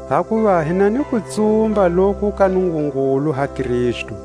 Hakuva hi na ni kutsumba loku ka Nungungulu ha Kristu;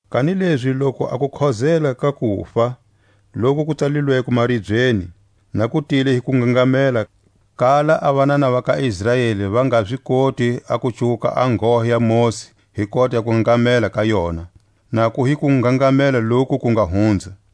Kanilezi loku a kukhozela ka kufa, loku ku tsalilweko maribyeni, na ku tile hi kungangamela kala a vanana va ka Israeli va nga zi koti a ku cuwuka a nghohe ya Mosi hi kota ya kungangamela ka yona; na ku hi kungangamela loku ku nga hunza;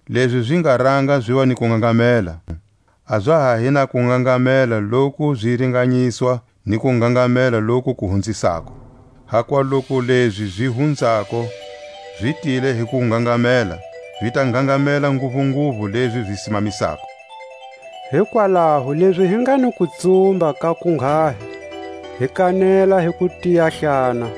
Lezi zi nga ranga ziva ni kungangamela, a za ha hi na kungangamela loku zi ringanyiswa ni kungangamela loku ku hunzisako. Hakuva loku lezi zi hunzako zi tile hi kungangamela, zi ta ngangamela nguvunguvu lezi zi simamisako. Hikwalaho lezi hi nga ni kutsumba ka kunghahi, hi kanela hi kutiyahlana,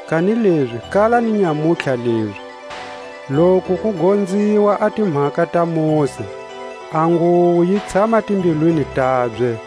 Kanilezi kala ni nyamutlha lezi, loku ku gonziwa a timhaka ta Mosi, a nguwo yi tshama timbilwini tabye.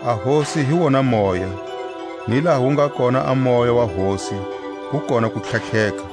A Hosi hi wona Moya, ni laha wu nga kona a Moya wa Hosi, ku kona kutlhatlheka.